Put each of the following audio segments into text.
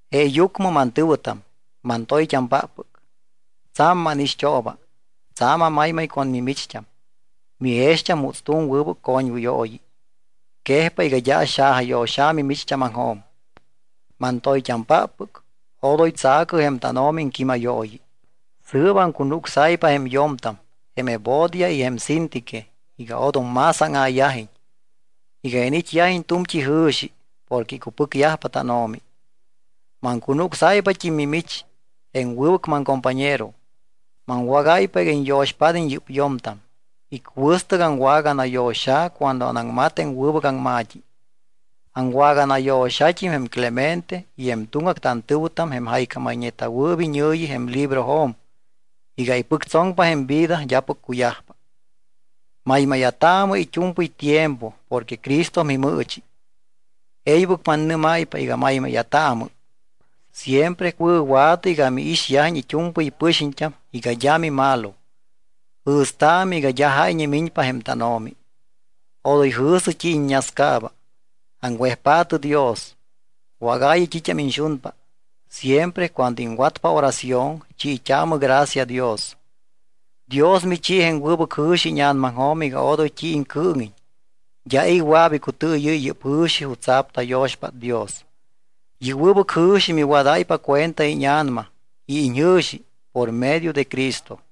Jeeyucmɨ mantɨ̱wɨtam, mantoyt́ampáppɨc, tsa̱m mánixt́ooba. Tsa̱m amaymay con mimicht́am. Mijext́am juuts tu̱m wɨbɨc coñwɨyooyi. Quejpa iga d́a axajayo̱xa̱ mimicht́ámaŋjo̱m. Mantoyt́ampáppɨc, odoy tsa̱cɨ jém tánO̱mi iŋquímayooyi. Sɨɨp aŋcunucsáypa jém yo̱mtam jém Evodia y jém Síntique iga odom más áŋa̱yajiñ, iga iniit́yajiñ tu̱mt́i jɨ̱xi porque icupɨcyajpa tánO̱mi. Maŋcunucsáypat́im mimich, jém wɨbɨc maŋcompañero. Maŋwágáypa iga iñyo̱xpád́iñ yɨ́p yo̱mtam. Icuɨstɨc aŋwaganayo̱xa̱ cuando anaŋmat jém wɨbɨc aŋma̱t́i. Aŋwaganayo̱xat́im jém Clemente y jém tuŋgac tantɨ̱wɨtam jém jaycámayñeta̱wɨɨp iñɨ̱yi jém librojo̱m iga ipɨctsoŋpa jém vida d́apɨc cuyajpa. Maymáya̱taamɨ it́u̱mpɨy tiempo porque Cristo mimɨɨchi. E̱ybɨc mannɨ́máypa iga maymáya̱taamɨ. Siempre wɨ̱wa̱tɨ iga miixyajiñ it́u̱mpɨy pɨxiñt́am iga d́a mimalo. Jɨ̱staamɨ iga d́a jáyñe miñpa jém tánO̱mi. Odoy jɨ̱sɨ t́i iññascaaba. Aŋwejpaatɨ Dios, wágaayɨ t́it́am iñxunpa. Siempre cuando iŋwatpa oración chiit́aamɨ gracia Dios. Dios michi jém wɨbɨc jɨ̱xi íña̱namaŋjo̱m iga odoy t́i iŋcɨɨŋiñ. D́a i̱ wɨa̱p icutɨɨyɨ́y yɨ́p jɨ̱xi jutsa̱p tayo̱xpát Dios. Yɨ́p wɨbɨc jɨ̱xi miwadáypa cuenta íña̱nama y iñjɨ̱xi por medio de Jesucristo.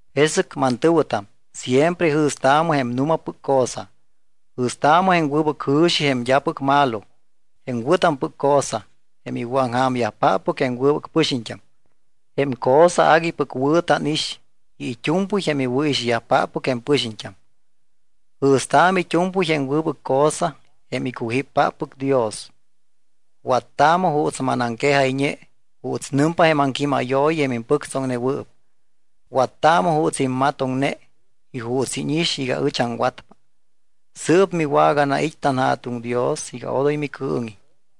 Jesɨc, mantɨ̱wɨtam, siempre jɨ̱staamɨ jém nu̱mapɨc cosa. Jɨ̱staamɨ jém wɨbɨc jɨ̱xi, jém d́apɨc malo, jém wɨ̱tampɨc cosa, jém iwɨ̱aŋja̱myajpáppɨc jém wɨbɨc pɨxiñt́am, jém cosa aguipɨc wɨ̱ tánix y it́u̱mpɨy jém iwɨ̱ixyajpáppɨc jém pɨxiñt́am. Jɨ̱staamɨ it́u̱mpɨy jém wɨbɨc cosa jém icujíppáppɨc Dios. Wattaamɨ juuts manaŋquejayñe juuts nɨmpa jém aŋquímayooyi jém impɨctsoŋnewɨɨp. Wattaamɨ juuts immatoŋne y juuts íñix iga ɨch aŋwatpa. Sɨɨp miwaganait́ tanJa̱tuŋ Dios iga odoy micɨɨŋiñ.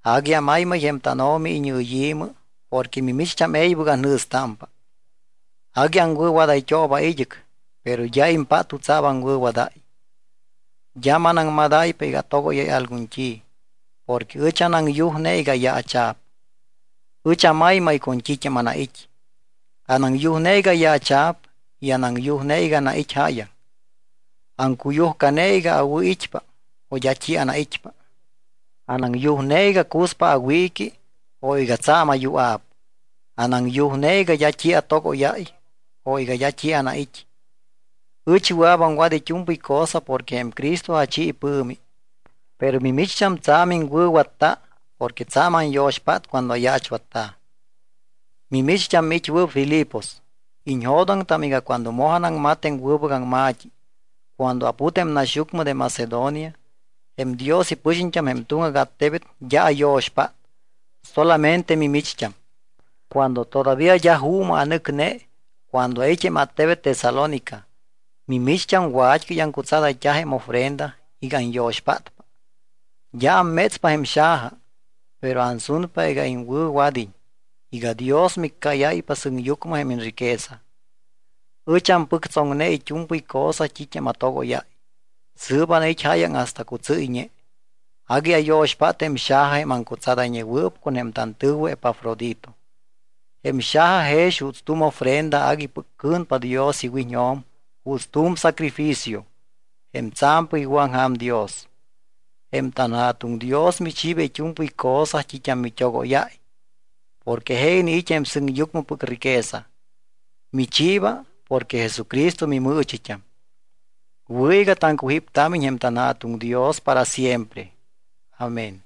Agui amaymay jém tánO̱mi iñɨyi̱mɨ porque mimicht́am e̱ybɨc anjɨ̱stámpa. Agui aŋwɨ̱wadayt́ooba id́ɨc, pero d́a impát jutsa̱p aŋwɨ̱wadáy. D́a manaŋmadáypa iga atogóyáy algun t́i. Porque ɨch anaŋyujne iga ayaacha̱p. Ɨch amaymay con t́it́am anait́. Anaŋyujne iga ayaacha̱p y anaŋyujne iga anait́ jáyaŋ. Aŋcuyujcane iga awɨ̱it́pa o d́a t́i anait́pa. Anaŋyujne iga cuspa awiiqui o iga tsa̱m ayua̱p. Anaŋyujne iga d́a t́i atogóyáy o d́a t́i anait́. Ɨch wɨa̱p aŋwat it́u̱mpɨy cosa porque jém Cristo achi ipɨ̱mi. Pero mimicht́am tsa̱m iŋwɨ̱watta porque tsa̱m anyo̱xpát cuando ayaachwatta̱. Mimicht́am, miit́wɨɨp Filipos, iñjo̱doŋtam iga cuando moj anaŋmat jém wɨbɨc aŋma̱t́i, cuando aput jém naxyucmɨ de Macedonia, jém Dios ipɨxiñt́am jém tuŋgac attebet d́a ayo̱xpát solamente mimicht́am. Cuando todavía d́a juumɨ anɨcne, cuando ait́ jém attebet Tesalónica, mimicht́am wat́cɨy aŋcutsadayt́a jém ofrenda iga anyo̱xpátpa. D́a ammétspa jém xaja, pero ansunpa iga iŋwɨ̱wad́iñ iga Dios miccáyáypa sɨŋyucmɨ jém iñriqueza. Ɨch ampɨctsoŋne it́u̱mpɨy cosa t́it́am atogóyáy. Sɨɨp anait́ jáyaŋ hasta cutsɨ́yñe. Agui ayo̱xpát jém xaja jém aŋcutsadayñewɨɨp con jém tantɨ̱wɨ Epafrodito. Jém xaja jex juuts tu̱m ofrenda aguipɨc cɨ̱npa Dios iwiñjo̱m juuts tu̱m sacrificio, jém tsa̱mpɨc iwɨ̱aŋja̱m Dios. Jém tanJa̱tuŋ Dios michiiba it́u̱mpɨy cosa t́it́am mit́ogóyáy porque je iniit́ jém sɨŋyucmɨpɨc riqueza. Michiiba porque Jesucristo mimɨɨchit́am. Wɨ̱ iga taŋcujíptámiñ jém tanJa̱tuŋ Dios para siempre. Amén.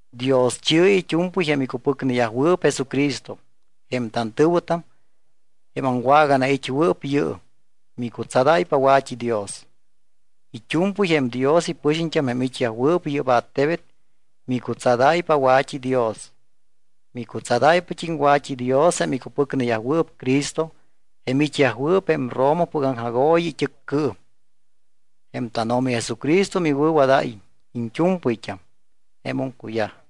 Dioschi̱ɨ it́u̱mpɨy jém icupɨcneyajwɨɨp Jesucristo. Jém tantɨ̱wɨtam, jém aŋwaganait́wɨɨp yɨɨm, micutsadáypa wa̱t́idios. It́u̱mpɨy jém Dios ipɨxiñt́am jém it́yajwɨɨp yɨ́p attebet micutsadáypa wa̱t́idios. Micutsadáypat́im wa̱t́idios jém icupɨcneyajwɨɨp Cristo jém it́yajwɨɨp jém Romapɨc aŋjagooyi it́ɨccɨɨm. Jém tánO̱mi Jesucristo miwɨ̱wadáyiñ iñt́u̱mpɨyt́am. Jemum cuyaj.